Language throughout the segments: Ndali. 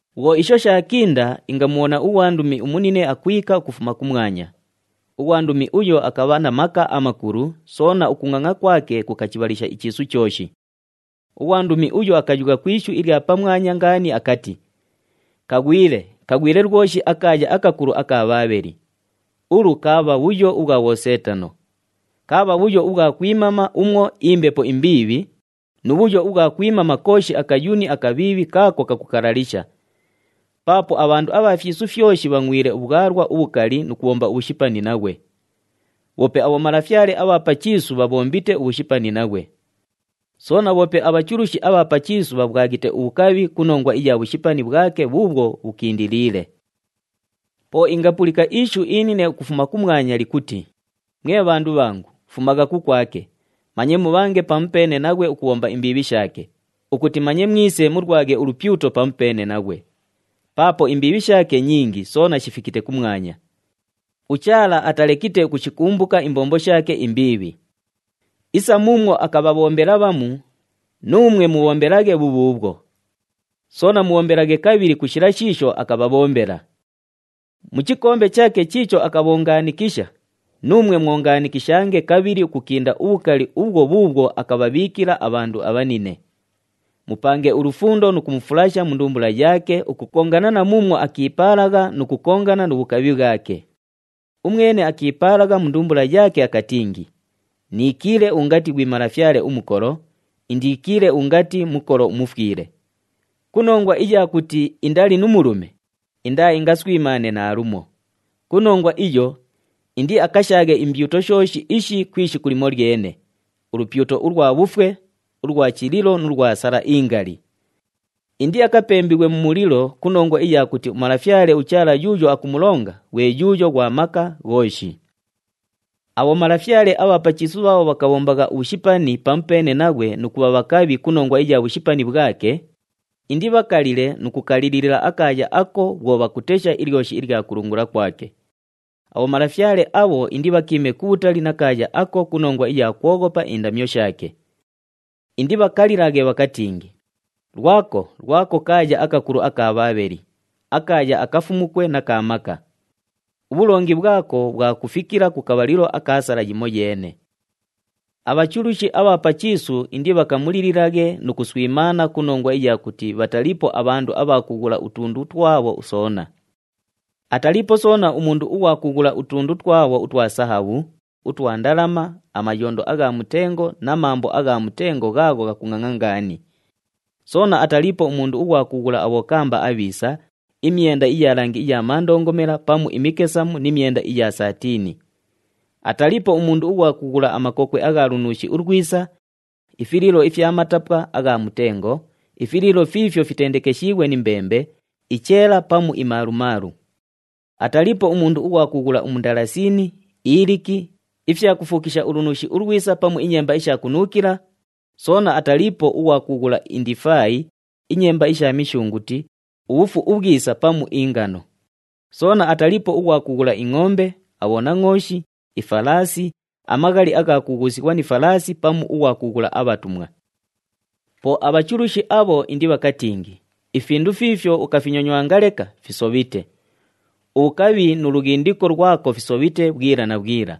Bhwo isho shaakinda, ingamubhona ughwandumi umunine akwika ukufuma kumwanya. Ughwandumi uyo akabha na maka amakulu, soona ukungʼangʼa kwake kukachibhalisha ichiisu chooshi. Ughwandumi uyo akayugha ku ishu ilya pamwanya ngaani akati, “Kaghwile! Kaghwile lwoshi akaaya akakulu aka Bhaabheli! Ulu kaabha bhuyo ubhwa bhoseetano. Kaabha bhuyo ubhwa kwimama umwo imbepo imbiibhi, nu bhuyo ubhwa kwimama kooshi akayuni akabhiibhi kaako kakukalalisha. Paapo abhandu abha fyisu fyoshi bhangʼwile ubhwalwa ubhukali nu kubhomba ubhushipani naghwe. Bhoope abhomalafyale abha pa chiisu bhabhombite ubhushipani naghwe. Soona bhoope abhachulushi abha pa chiisu bhabhwaghite ubhukabhi ku nongwa iya bhushipani bhwake bhuubhwo bhukindiliile.” Po ingapulika ishu inine ukufuma kumwanya likuti, “Mwe bhandu bhangu, fumagha kukwake, manye mubhange pamupeene naghwe ukubhomba imbiibhi shaake, ukuti manye mwise mulwaghe ulupyuto pamupeene naghwe. Paapo imbiibhi shaake nyingi soona shifikite kumwanya. UChaala atalekite ukushikumbuka imbombo shaake imbiibhi. Isa muumwo akabhabhombela bhamu, nuumwe mubhombelaghe bhubhuubhwo. Soona mubhombelaghe kabhili ku shila shiisho akabhabhombela. Mu chikombe chaake chiicho akabhongaanikisha, nuumwe mwongaanikishange kabhili ukukinda ubhukali ubhwo bhuubhwo akabhabhiikila abhandu abhanine. Mupange ulufundo nu kumufulasha mu ndumbula yaake ukukongana na muumwo akiipaalagha nu kukongana nu bhukabhi bhwake. Umwene akiipaalagha mu ndumbula yaake akatingi, ‘Niikiile ungati ghwi malafyale umukolo, indiikiile ungati mukolo umufwile!’ Ku nongwa iya kuti indali nu mulume, indaaingaswimaane naalumo. Ku nongwa iyo, indiakashaaghe imbyuto shooshi ishi ku ishiku limolyene, ulupyuto ulwa bhufwe, ulwa chililo nu lwa sala ingali. Indiakapembighwe mu mulilo ku nongwa iya kuti uMalafyale uChaala yuuyo akumulonga ghwe yuuyo ghwa maka ghooshi.” Abhomalafyale abha pa chiisu bhaabho bhakabhombagha ubhushipani pamupeene naghwe nu kubha bhakabhi ku nongwa iya bhushipani bhwake, indibhakalile nu kukalilila akaaya ako bhwo bhakutesha ilyoshi ilya kulungula kwake. Abhomalafyale abho indibhakiime kubhutali na kaaya ako ku nongwa iya kwoghopa indamyo shaake. Indibhakalilaghe bhakatingi, “Lwako, lwako kaaya akakulu aka Bhaabheli, akaaya akafumukwe na ka maka! Ubhulongi bhwako bhwakufikila ku kabhalilo aka sala yimoyeene.” Abhachulushi abha pa chiisu indibhakamulililaghe nu kuswimaana ku nongwa iya kuti bhataliipo abhandu abha kughula utundu twabho soona. Ataliipo soona umundu ughwa kughula utundu twabho utwa sahabhu, utwa ndalama, amayondo agha mutengo na mambo agha mutengo ghaagho ghakungʼangʼa ngaani. Soona ataliipo umundu ughwa kughula abhokamba abhiisa, imyenda iya langi iya mandongomela pamu imikesamu ni myenda iya saatini. Ataliipo umundu ughwa kughula amakokwe agha lunuushi ulwisa, ifiliilo ifya matapwa agha mutengo, ifiliilo fiifyo fitendekeshiighwe ni mbembe, icheela pamu imalumalu. Ataliipo umundu ughwa kughula umundalasini, iliki, ifyakufuukisha ulunuushi ulwisa pamu inyemba isha kunuukila, soona ataliipo ughwa kughula indifaayi, inyemba isha mishunguti, ubhufu ubhwisa pamu ingano. Soona ataliipo ughwa kughula ingʼombe, abhonangʼooshi, ifalaasi, amaghali agha kughuusighwa ni falaasi pamu ughwa kughula abhatumwa. Po abhachulushi abho indibhakatingi, “Ifindu fiifyo ukafinyonywanga leka, fisobhite. Ubhukabhi nu lughindiko lwako fisobhite bhwila na bhwila.”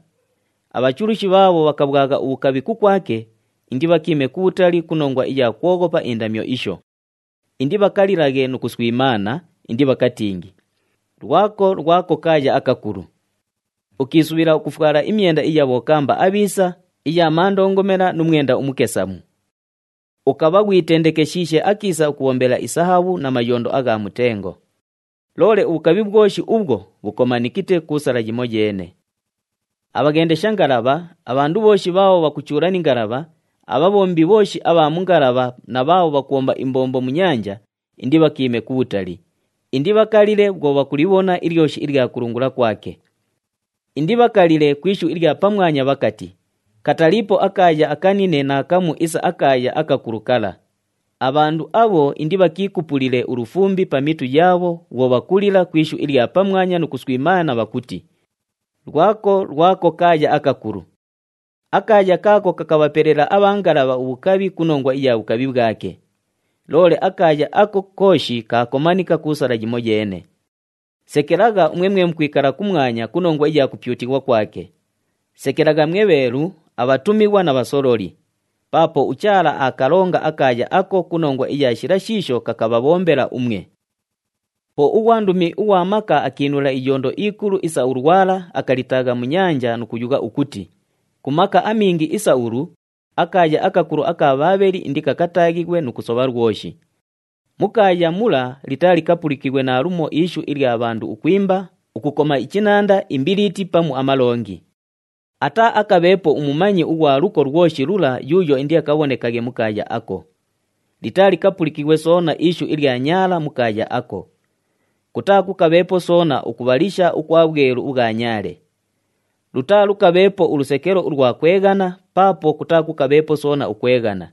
Abhachulushi bhaabho bhakabhwagha ubhukabhi kukwake, indibhakiime kubhutali ku nongwa iya kwoghopa indamyo isho. Indibhakalilaghe nu kuswimaana, indibhakatingi, “Lwako, lwako kaaya akakulu. Ukiisubhila ukufwala imyenda iya bhokamba abhiisa, iya mandongomela nu mwenda umukesamu. Ukabha ghwitendekeshiishe akiisa ukubhombela isahabhu na mayondo agha mutengo. Loole ubhukabhi bhwoshi ubhwo, bhukomanikite ku sala yimoyeene.” Abhaghendesha ngalabha, abhandu bhooshi bhaabho bhakuchuula ni ngalabha, abhabhombi bhooshi abha mu ngalabha na bhaabho bhakubhomba imbombo mu nyanja, indibhakiime kubhutali, indibhakalile bhwo bhakulibhona ilyoshi ilya kulungula kwake. Indibhakalile ku ishu ilya pamwanya bhakati, “Kataliipo akaaya akanine naakamu isa akaaya akakulu kala!” Abhandu abho indibhakiikupulile ulufumbi pa mitu yaabho bhwo bhakulila ku ishu ilya pamwanya nu kuswimaana bhakuti, “Lwako, lwako kaaya akakulu! Akaaya kaako kakabhapelela abha ngalabha ubhukabhi ku nongwa iya bhukabhi bhwake. Loole akaaya ako kooshi kaakomanika ku sala yimoyeene.” Sekelagha umwe mwe mukwikala kumwanya ku nongwa iya kupyutighwa kwake. Sekelagha mwe bheelu, abhatumighwa na bhasololi! Paapo uChaala aakalonga akaaya ako ku nongwa iya shila shiisho kakabhabhombela umwe. Po ughwandumi ughwa maka akiinula iyondo ikulu isa ulwala, akalitaagha mu nyanja nu kuyugha ukuti, “Ku maka amingi isa ulu, akaaya akakulu aka Bhaabheli indikakataaghighwe nu kusobha lwoshi. Mu kaaya mula litaalikapulikighwe naalumo ishu ilya bhandu ukwimba, ukukoma ichinanda, imbiliiti pamu amalongi. Ataaakabheepo umumanyi ughwa luko lwoshi lula yuuyo indiakabhonekaghe mu kaaya ako. Litaalikapulikighwe soona ishu ilya nyaala mu kaaya ako. Kutaakukabheepo soona ukubhalisha ukwa bhwelu ubhwa nyaale. Lutaalukabheepo ulusekelo ulwa kweghana, paapo kutaakukabheepo soona ukweghana.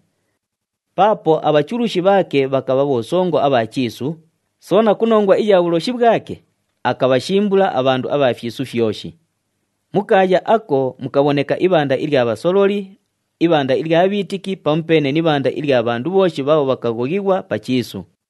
Paapo abhachulushi bhaake bhakabha bhosongo abha chiisu, soona ku nongwa iya bhuloshi bhwake, akabhashimbula abhandu abha fyisu fyoshi. Mu kaaya ako mukabhoneka ibhanda ilya bhasololi, ibhanda ilya bhiitiki pamupeene ni ibhanda ilya bhandu bhooshi bhaabho bhakaghoghighwa pa chiisu.”